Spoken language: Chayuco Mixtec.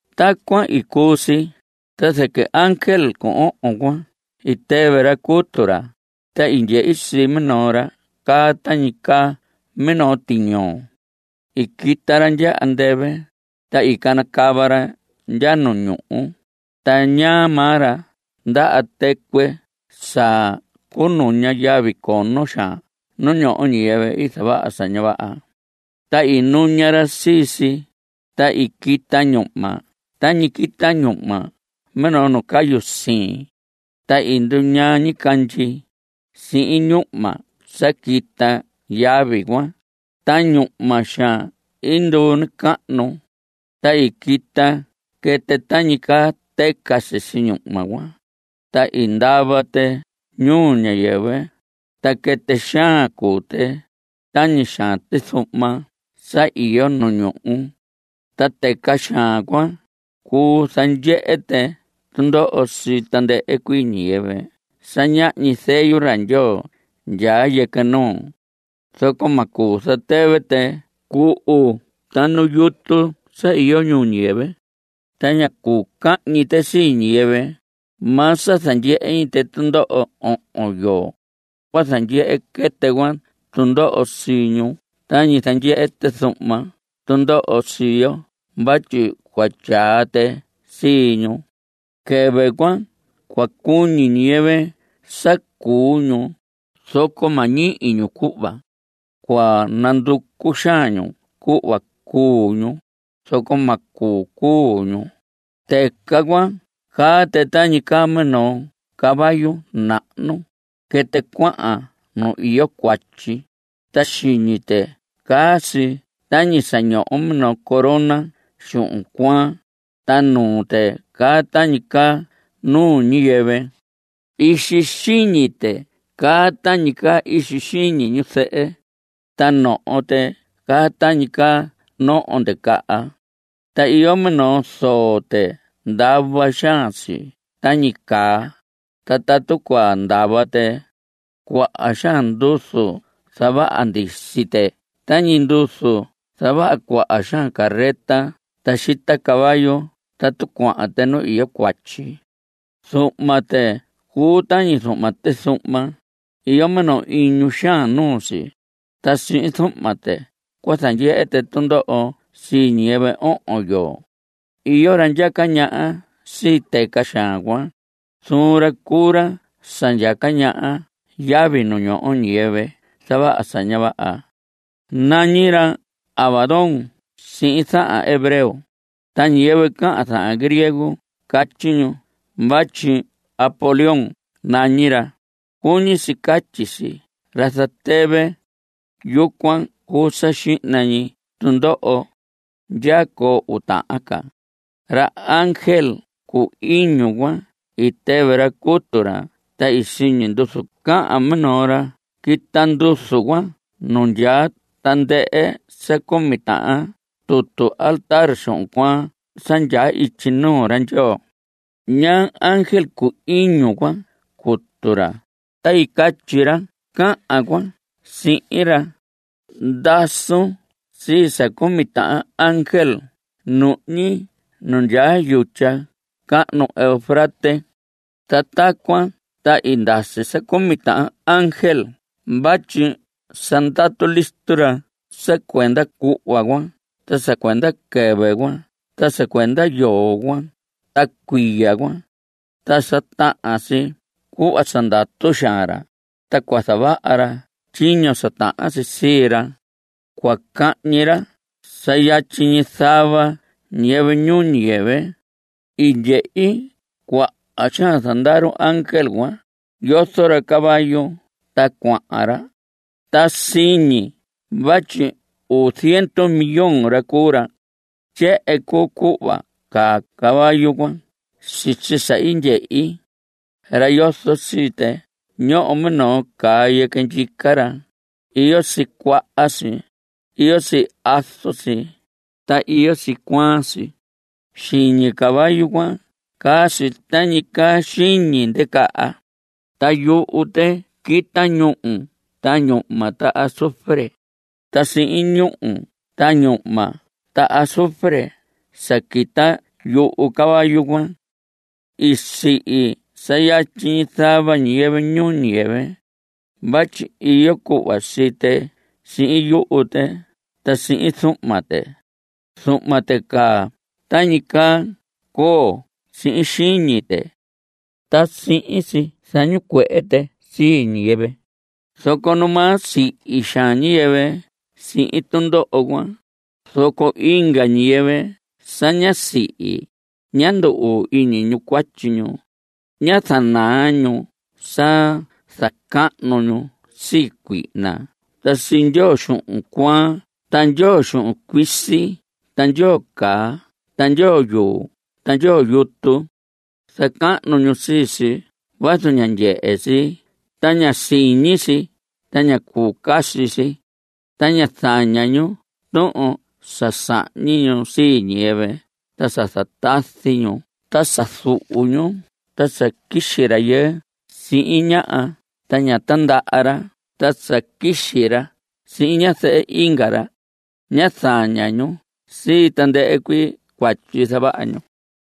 Tacuan i cuu si, ta zɨquɨ ángel cu ohon cuan i tɨvɨ ra cutu ra, ta i ndyehi sii minoo ra caa tañi caa minoo tiñoo. I quita ra ndya andɨvɨ, ta i canacava ra ndya nu ñuhu. Ta ñaa maa ra ndaha tɨcuɨ sa cuu nuña yavi cono xaan nu ñoho ñiyɨvɨ zavaha sa ña vaha. Ta i nuña ra sii si, ta i quita ñuhma tañi quita ñuhma minoo nu cayu siin. Ta i nduñaa ñicandyi, sihin ñuhma sa quita yavi cuan, ta ñuhma xaan i nduu nacahnu. Ta i quita quɨtɨ tañi caa tɨca sisi ñuhma cuan, ta i ndava tɨ ñuu ñiyɨvɨ. Ta quɨtɨ xaan cuu tɨ, tañi xaan tizuhma sa iyo nu ñuhu. Ta tɨca xaan cuan, cuu zandyehe tɨ tundoho sii tandɨhɨ ñiyɨvɨ sa ñahñi zeyu ra Ndyoo ndyaa yɨquɨ nuu. Zoco ma cuu zatɨvɨ tɨ cuhu ta nu yutu sa iyo ñuu ñiyɨvɨ. Ta ña cuu cahñi tɨ sii ñiyɨvɨ. Maa sa ndyehe ñi ñu tundoho ohon yoo. Cua zandyehe quɨtɨ cuan tundoho sii ñu tañi zandyehe tizuhma tundoho sii yo vatyi cua tyaa tɨ sii ñu. Quɨvɨ cuan cua cuñi ñiyɨvɨ sa cuu ñu, zoco ma ñihi ñu cuhva. Cua nanducu xaan ñu cuhva cuu ñu, zoco ma cuu cuu ñu. Tɨca cuan caa tɨ tañi caa caballo nahnu. Quɨtɨ cuahan nu iyo cuatyi. Ta xiñi tɨ caa si tañi sa ñoho minoo corona xuhun cuaan. Ta nuu tɨ caa tañi caa nuu ñiyɨvɨ. Ixi xiñi tɨ caa tañi caa ixi xiñi ñu zɨhɨ. Ta noho tɨ caa tañi caa noho ndicaha. Ta iyo minoo zoo tɨ ndava xaan si tañi caa. Ta tatu cua ndava tɨ, cuaha xaan nduzu zavaha ndisi tɨ tañi nduzu zavaha cuaha xaan carreta sa xita caballo tatu cuahan tɨ nu iyo cuatyi. Zuhma tɨ cuu tañi zuhma tizuhma. Iyo minoo iñu xaan nuu si. Ta sihin zuhma tɨ cua zandyehe tɨ tundoho sii ñiyɨvɨ ohon yoo. Iyo ra ndyaca ñaha sii tɨca xaan cuan. Zuun ra cuu ra sa ndyaca ñaha yavi nu ñoho ñiyɨvɨ i zavaha sa ña vaha. Nañi ra Abadón sihin zahan hebreo. Ta ñiyɨvɨ cahan zahan griego catyi ñu vatyi Apolión nañi ra. Cuñi si catyi si ra zatɨvɨ. Yucuan cuu sa xihna ñi tundoho. Ndyaa coo uu tahan ca. Ra ángel cu iñu cuan i tɨvɨ ra cutu ra ta siñi nduzu cahan minoo ra. Quita nduzu cuan nu ndyaa tandɨhɨ sa cumi tahan tutu altar xuhun cuaan sa ndyaa ityi nuu ra Ndyoo. Ñaa ángel cu iñu cuan cutu ra, ta i catyi ra cahan cuan sihin ra: Ndasun sii sa cumi tahan ángel nuhñi nu ndyaa yutya cahnu Eufrates. Ta tacuan ta i ndasi sa cumi tahan ángel vatyi sa ndatu listo ra sa cuenda cuhva cuan ta sa cuenda quɨvɨ cuan ta sa cuenda yoo cuan ta cuiya cuan. Ta sa tahan si cuhva sa ndatu xaan ra, ta cua zavaha ra tyiño sa tahan si sii ra. Cua cahñi ra sa yatyi zava ñiyɨvɨ ñuu ñiyɨvɨ. I ndyehi cuaha xaan zandaru ángel cuan; yozo ra caballo ta cuahan ra. Ta siñi vatyi uu ziendu millón ra cuu ra. Tyehen cuu cuhva caa caballo cuan sisi sa i ndyehi. Ra yozo sii tɨ ñoho minoo caa yɨquɨ ndyica ra. Iyo si cuaha si. Iyo si azu si, ta iyo si cuaan si. Xiñi caballo cuan caa si tañi caa xiñi ndicaha. Ta yuhu tɨ quita ñúhu ta ñuhma ta azufre. Ta sihin ñúhu ta ñuhma ta azufre sa quita yuhu caballo cuan, i sihi sa yatyi zava ñiyɨvɨ ñuu ñiyɨvɨ. Vatyi iyo cuhva sii tɨ sihin yuhu tɨ ta sihin zuhma tɨ. Zuhma tɨ caa tañi caa coo sihin xiñi tɨ. Ta sihin si zañicuehe tɨ sii ñiyɨvɨ. Zoco numaa sihi xaan ñiyɨvɨ sihin tundoho cuan, zoco inga ñiyɨvɨ sa ñá sihi, ñá ndu‑uu iñi ñu cuatyi ñu. Ñá zaña ñu sa zacahnu ñu sii cuihna ta sii ndyoo xuhun cuaan ta ndyoo xuhun cuisi ta ndyoo caa ta ndyoo yuu ta ndyoo yutu. Zacahnu ñu sii si vazu ña ndyehe si ta ña siñi si ta ña cuu caca si. Ta ñá zaña ñu tuhun sa sahñi ñu sii ñiyɨvɨ ta sa zatazi ñu ta sa zuhu ñu ta sa quixi rayɨɨ sihin ñaha ta ñá tandaha ra ta sa quixi ra sihin ñazɨhɨ inga ra. Ñá zaña ñu sii tandɨhɨ cuii cuatyi zavaha ñu.